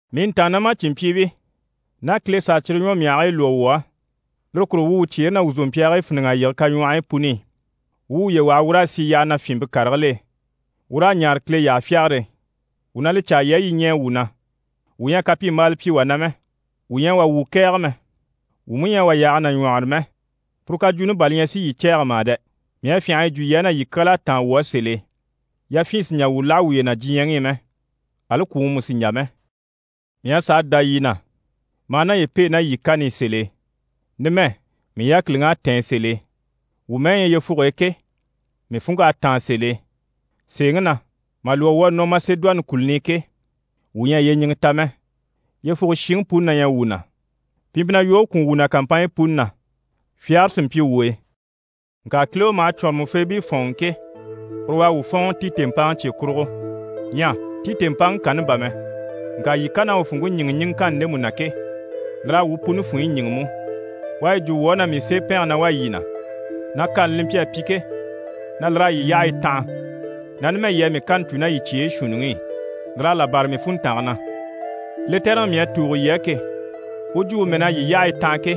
Mii ntàannamacinmpyiibii, ná Kile s'à cyire ɲwɔmyahigii lwɔ́ wuu á, lire kurugo wuu wuu cyeere ná wuu zòmpyaagii fíniŋ'a yige kaɲwɔhɔyi puni i, wuu wuye waha wuu raa sì yyaha na fyìnmpe karigil'e, wuu raa ɲaare Kile yyahafyagare e. Wuu na li caa yii á, yii ɲɛɛ wuu na. Wuu ɲyɛ a kapyimbaala pyi wà na mɛ, wuu ɲyɛ a wà wuu kɛ̀ɛge mɛ, wuu mú ɲyɛ a wà yaaga nàɲwɔhɔrɔ mɛ. Puru kajwuuni bà li ɲyɛ si yii cɛ̂ɛgɛ mà dɛ! Mii à fyânha a yi jwo yii á, na yii kyal'à táan wuu á sèl'e. Yafyin sì n‑jà wuu láha wuye na diɲyɛŋi i mɛ, ali kwùŋi mú sì n‑jà mɛ. Mii à sàa dá yii na, maa naye pêe ná yii kani i sèl'e. Numɛ, mii yákiliŋ'à tɛ̀ɛn sèl'e. Wuu mɛ́ɛ ɲyɛ yyefuge e ke, mii funŋk'à táan sèl'e. Sèeŋi na, mà lwɔ́ wuu à nɔ Masedoni kùluni i ke, wuu ɲyɛ a yyeɲiŋɛ ta mɛ. Yyefuge shiŋi puni na ɲyɛ wuu na. Pi mpyi na yoge kwùun wuu na kàmpanɲyi puni na, fyagare sí mpyi wuu e. Ŋka Kile u maha cwɔ̀nrɔmɔfeebii fɔ̀ɔnŋi ke, uru u à wuu fɔ̀ɔnŋɔ Titi mpaŋi cye kurugo. Ɲyɛ Titi mpaŋi kanni bà mɛ, ŋka yii kan'à u funŋke ɲíŋɛ ɲiŋɛŋkanni ndemu na ke, lir'à wuu puni funɲyi ɲíŋɛ mú. U à yi jwo wuu á na mii seepɛnge na wá yii na, na kani li mpyi a pyi ke, na lir'à yii yyahayi tanha, na numɛ yii à mii kani cû ná yii cyeyi shuunniŋi i. Lir'à là bâra mii funntange na. Lɛtɛrɛŋi mii à tùugo yii á ke, u jwumpe mɛ́n'à yii yyahayi tanha ke,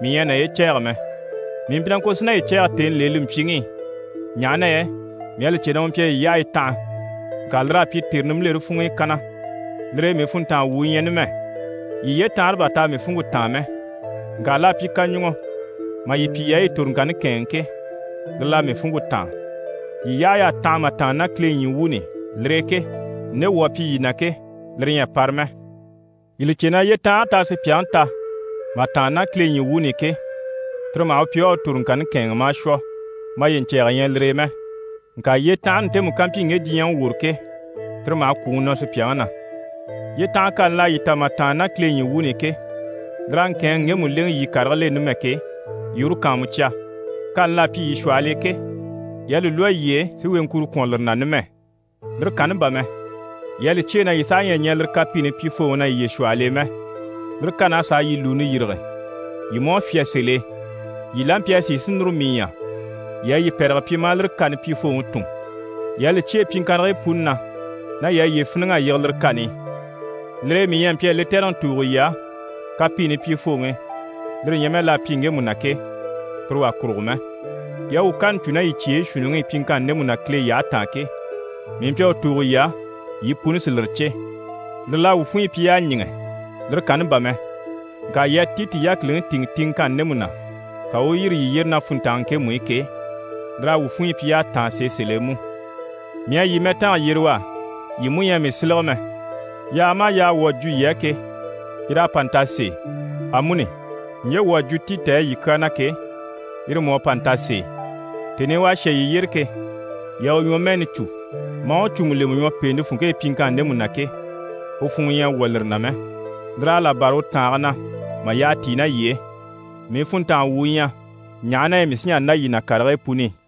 mii ɲyɛ a naye cɛ̂ɛgɛ mɛ. Mii mpyi na ŋko si naye cɛ̂ɛgɛ tèni l'e li mpyiŋi i, ɲaha na yɛ mii à li cè na u mpyi a yii yyahayi tanha, ŋka lir'à pyi tère nimbilere funŋ'i kanna. Lire e mii funntanga wu u ɲyɛ numɛ. Yii yyetanhare bà t'à mii funŋke táan mɛ, ŋka l'à pyi kaɲuŋɔ mà yii pyi yii à yii toroŋkanni kɛ̂ɛnŋɛ ke, lire l'à mii funŋke táan. Yii yyahay'à tanha mà tàanna ná Kile ɲyii wuuni i, lire e ke, nde wuu à pyi yii na ke, lire ɲyɛ a para mɛ. Yii li cè na yyetanhare t'à sùpyaŋi ta mà tàanna ná Kile ɲyii wuuni i ke, tire maha u pyi u à u toroŋkanni kɛ̂ɛnŋɛ maa shwɔ. Maye ɲcɛ̀ɛgɛ ɲyɛ lire e mɛ. Ŋka yyetanhare ntemu ká mpyi ŋge diɲyɛŋi woro ke, tire maha kwùŋi nɔ sùpyaŋi na. Yyetanha kani l'à yii ta mà tàanna ná Kile ɲyii wuuni i ke, lir'à ŋkɛ̀ɛnŋi ŋgemu lèŋɛ yii karigil'e numɛ ke, yii uru kàanmucya. Kani l'à pyi yii shwɔhɔl'e ke, yii à li lwɔ́ yiye e si weŋkuro kwɔ̀n lire na numɛ. Lire kanni bà mɛ, yii à li cyêe na yii saha ɲyɛ a ɲɛɛ lire kapiini pyifooŋi na yiye shwɔhɔl'e mɛ. Lire kan'à sàa yii lùuni yîrige. Yii mú à fyá sèl'e. Yii la mpyi a sìi si núru mii ɲya, yii à yii pɛ̀rɛge pyi maa lire kani pyifooŋi tùn. Yii à li cyêe pyiŋkannigii puni na, na yii à yiye fíniŋ'a yige lire kani i. Lire e mii ɲyɛ a mpyi a lɛtɛrɛŋi tùugo yii á, kapiini pyifooŋi, lire ɲyɛ mɛ l'à pyi ŋgemu na ke, pire wà kurugo mɛ. Yii à wuu kani cû ná yii cyeyi shuunniŋi i pyiŋkanni ndemu na Kile yyahe taan ke, mii mpyi a u tùugo yii á, yii puni si lire cè. Lire l'à wuu funɲyi pyi y'à ɲíŋɛ. Lire kanni bà mɛ, ŋka yii à Titi yákiliŋi tìŋɛ tiŋɛŋkanni ndemu na, ka u u yîri yii yyére ná funntange ŋkemu i ke, lir'à wuu funɲyi pyi y'à táan sèe sèl'e mú. Mii à yii mɛtanga yyere u á, yii mú ɲyɛ a mii sílege mɛ. Yaaga maha yaaga wuu à jwo yii á ke, yir'à pa nta sèe. Amuni, ɲje wuu à jwo Titi á yii kyaa na ke, yire mú à pa nta sèe. Tèni i u à shà yii yyére ke, yii à u ɲwɔmɛɛni cû, maa u cùmu lemɛ ɲwɔ pèente funŋke e pyiŋkanni ndemu na ke, u funŋɔ ɲyɛ à wwɔ̀ lire na mɛ, lir'à là bâra u tàange na mà yyaha tíi ná yii e. Mii funntanga wu u ɲyɛ, ɲaha na yɛ mii sí n‑jà n‑dá yii na karigii puni i.